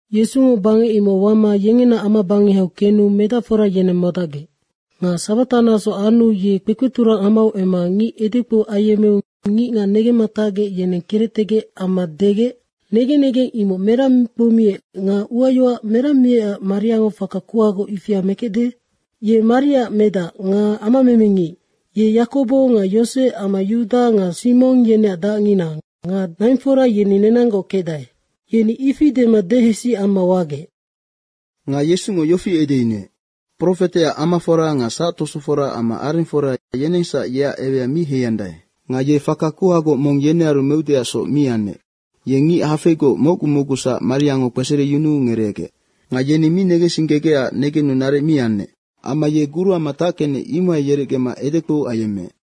Yesungo bangec imoc wama yengena amabangehau kenu medacfora yeneng modacgec. Nga sabata naso anu ye kpekpeturang amau emma ngic edekpou ayemmeu ngicngac negemma tacgec yeneng kerectegec amma degec, “Negen negeng imoc merang kpoumiec nga uayoac merang miecac mariango faka kuhagoc ifia mekecde? Ye Mariaac medac nga amamemengic. Ye Yakobo nga Yosec amma Yuda nga Simong yeneac dacngina nga naingfora yeni nenanggoc kecdae.” Yeni ifi dema dehesi amma wagec. Nga Yesungo yofi edeyunuec, “Profeteac amafora nga sactosofora amma arengfora, yenengsac yeac ewea mi heiandae.” Nga ye faka kuhagoc mong yenearu meudeacsoc mi anec. Ye ngic hafeigoc mocgu mocgusac mariango kpesereyunuu ngereegec. Nga yeni mi negensinggegecac negenu naric mi anec. Amma ye guruama tackenec, imohai yerecgema edekpou ayemmeec.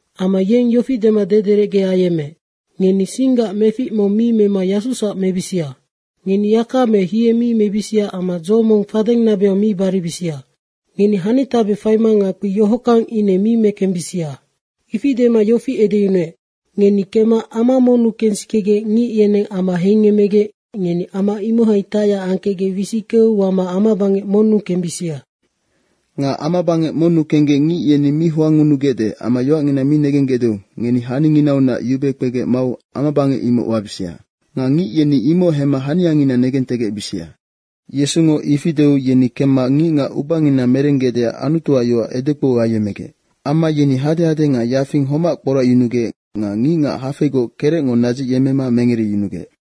Amma yeng yofi dema dederecge ayemmeec, “Ngeni singgac mefic mong mi mema yasusac mebisia. Ngeni yaka me hie mi mebisia amma dzo mong fadeng nabehau mi baribisia. Ngeni hanitabe faima ngakpi yohockang ine mi mekembisia.” Ifi dema yofi edeyunuec, “Ngeni kemma ama monnu kensikegec ngic yeneng ama heingemmegec ngeni ama imohai tacyac angkecgec wisickeu wama amabangec monnu kembisia. Nga amabangec monnu kenggec ngic yeni mi hoangngunugecde amma yoacngina mi negenggecdeu ngeni haninginaunac yube kpegec mau amabangec imoc wabisia. Nga ngic yeni imoc hemma haniangina negentegecbisia.” Yesungo ifi deu yeni kemma ngicngac ubangina merenggecdeac Anutuac yoac edekpou ayemmegec. Amma yeni hadehade nga yafing homac kporacyunugec nga ngicngac hafeigoc kerecngo nadzicyemmema mengereyunugec.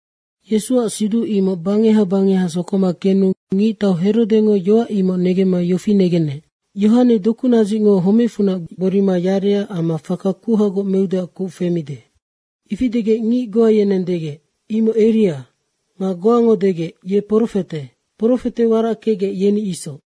Yesuac siduc imoc bangeha bangeha sokoma kenu ngictau Herodengo yoac imoc negemma yofi negenec, “Yohane dokunadzicngo homecfunac gborima yarecac amma faka kuhagoc meudeac kuc femide.” Ifi degec ngic goa yeneng degec, “Imoc Eria.” nga goango degec, “Ye profete. Profete warac kecgec, yeni isoc.”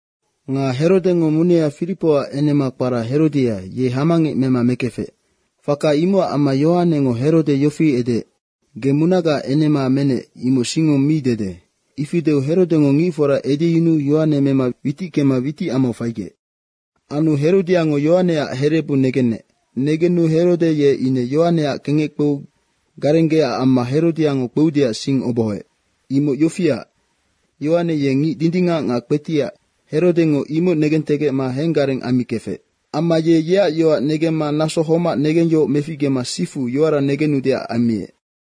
Nga Herodengo munea Firipoac enema kpara Herodia, ye hamangec mema mekefec. Faka imocac amma Yohanengo Herode yofi edeec, “Ge munagaac enema menec, imoc singngo mi dede.” Ifi deu Herodengo ngicfora edeyunuu Yohane mema witickema witicamau faigec. Anu Herodiango Yohaneac herebu negenec. Negenu Herode ye ine Yohaneac kengec kpeu garenggeecac amma Herodiango kpeudeac sing obohoec. Imoc yofiac, Yohane ye ngic dindingac nga kpetiac, Herodengo imoc negentegecma henggareng ammikefec. Amma ye yeac yoac negemma naso homac negengyohoc meficgema sifu yoara negenudeac ammiec.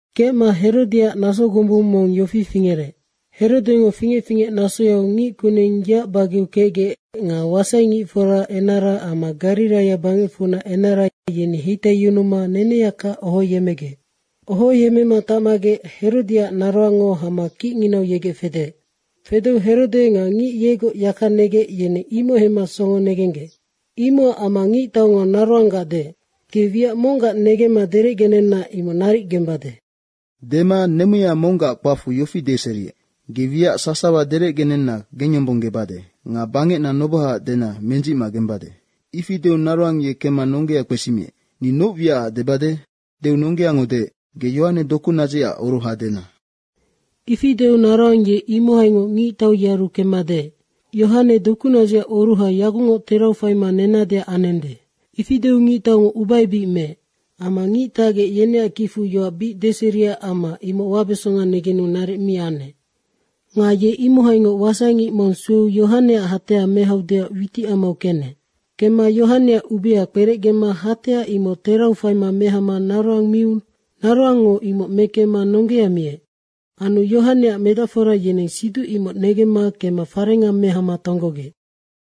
Kecma Herodiaac naso gombunga mong yofi fingerec. Herodengo fingec fingec nasoyau ngickuneng yeac bageau kecgec nga wasaingicforaac enara amma Gariraia bangecfunac ngicenara, yeni heitaiyunuma neneyaka ohoyemmegec. Ohoyemmema tacmagec Herodiaac naroangngo hama kicnginau yegec fedeec. Fedeu Herode nga ngic yegoc yaka negec, yeneng imoc hemma songo negenggec. Imocac amma ngictaungo naroanggac deec, “Ge wiac monggac negemma derecgenenna imoc naric gembade.” Dema nemuya monggac kpacfu yofi deseriec, “Ge wiac sasawa derecgenenna gengyombonggebade nga bangecna nobohaac dena mendzicma gembade.” Ifi deu naroang ye kemma nonggea kpesimiec, “Ni noc wiacac debade?” deu nonggeango deec, “Ge Yohane dokunadzicac oruha dena.” Ifi deu naroang ye imohaingoc ngictau yearu kemma deec, “Yohane dokunadzicac oruha yagucngoc terau faima nennadeac anende.” Ifi deu ngictaungo ubaebic meec. Amma ngic tacgec, yeneac kicfu yoac bic deseriecac amma ine imoc wabesonga negenu naric mi anec. Nga ye imohaingoc wasaingic mong sueu Yohaneac hatea mehaudeac witicamau kenec. Kemma Yohaneac ubia kperecgema hatea imoc terau faima mehama naroang miu naroangngo imoc mekemma nonggea miec. Anu Yohaneac medacfora yeneng siduc imoc negemma kemma farenga mehama tonggogec.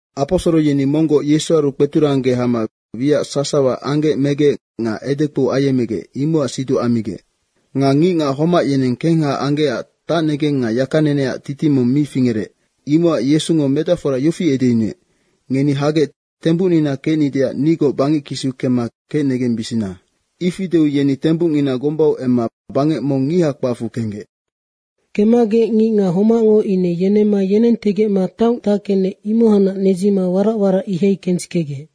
Aposoro yeni monggoc Yesuaru kpeturangge hama wiac sasawa anggec megec nga edekpou ayemmegec, imocac siduc ammigec. Nga ngicngac homac yeneng kengha anggecac tacnegeng nga yakaneneac titing mong mi fingerec. Imocac Yesungo medacfora yofi edeyunuec, “Ngeni hagec tembucnina kecnideac nigoc bangec kisiu kemma kecnegembisia.” Ifi deu yeni tembucngina gombau emma bangec mong ngiha kpacfu kenggec. Kemmagec ngicngac homacngo ine yenemma yenentegecma taong tackenec, imohacnac nedzima warac warac ihai kensikegec.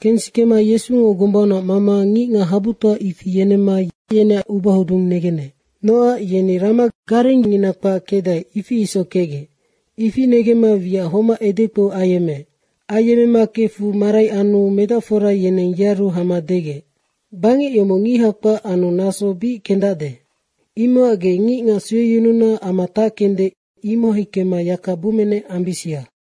Kensikema Yesungo gombaunac mama ngicngac habutoa ifi yenemma yeneac ubahodung negenec. Nocac yeni rama garengngina kpac kecdae, ifi isoc kecgec. Ifi negemma wiac homac edekpou ayemmeec. Ayemmema kefu marai anu medacfora yeneng yearu hama degec, “Bangec yomoc ngiha kpac anu naso bic kendacde. Imocac ge ngicngac sueyununa ama tackende, imohai kemma yaka bummenec ambisia.”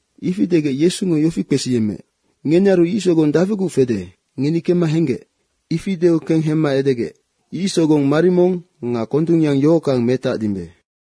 Ifi degec Yesungo yofi kpesiyemmeec, “Ngenearu ic sogong dafiguc fede, ngeni kemma henggec.” Ifi deu kenghemma edegec, “Ic sogong marimong nga kondungyang yohockang metacdimbe.”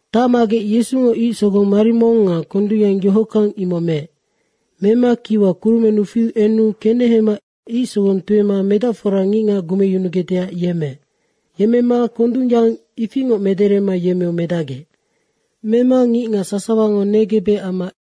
Tacmagec Yesungo ic sogong marimong nga kondungyang yohockang imoc meec. Mema kiwa kurumennu fiu enu kenehema ic sogong tuema medacfora ngicngac gumecyunugecdeac yemmeec. Yemmema kondungyang ifingoc mederema yemmeu medacgec. Mema ngicngac sasawango negebec amma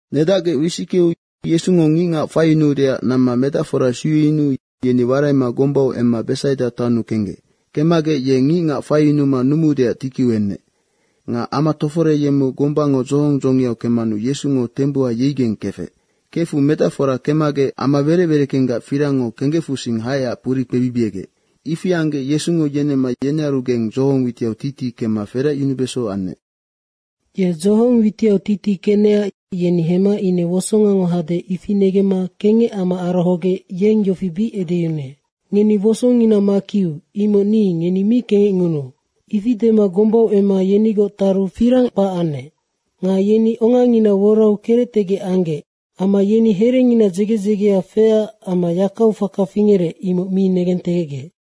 Nedacgec wisickeu Yesungo ngicngac faiyunuudeac namma medacfora sueyunuu yeni waraima gombau emma Besaida taonnu kenggec. Kemmagec ye ngicngac faiyunuma numuudeac tikiu enec. Nga ama toforeyemmeu gombango dzohong dzongiau kemmanu Yesungo tembuha yeigeng kefec. Kefu medacfora kemmagec ama werec wereckenggac firangngo kenggecfusing haecac puri kpebibiegec. Ifi anggec Yesungo yenemma yenearugeng dzohong witiau titi kemma feracyunubeso anec. Ye dzohong witiau titi kenecac yeni hemma ine wosongango hade, ifi negemma kengec amma arohogec yeng yofi bic edeyunuec, “Ngeni wosongina makiu, imoc ni, ngeni mi kengecngunuu.” ifi dema gombau emma yenigoc taru firang kpac anec. Nga yeni ongangina worau kerectegec anggec. Amma yeni herengina dzege dzegea feecac amma yakau faka fingerec, imoc mi negentegecgec.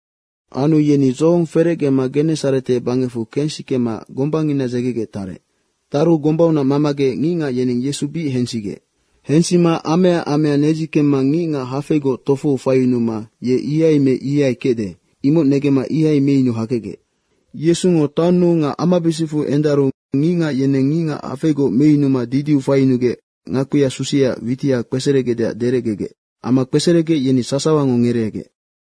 Anu yeni dzohong ferecgema Genesarete bangecfu kensikema gombangina dzegegec tarec. Taru gombaunac mamagec ngicngac yeneng Yesu bic hensigec. Hensima amea amea nedzikemma ngicngac hafeigoc tofou faiyunuma, “Ye ihai me ihai kecde.” imoc negemma ihai meyunu hakecgec. Yesungo taonnu nga amabisicfu endaru ngicngac yeneng ngicngac hafeigoc meyunuma didiu faiyunugec ngakpia susiaac witiha kpeseregecdeac derecgegec. Amma kpeseregec, yeni sasawango ngereegec.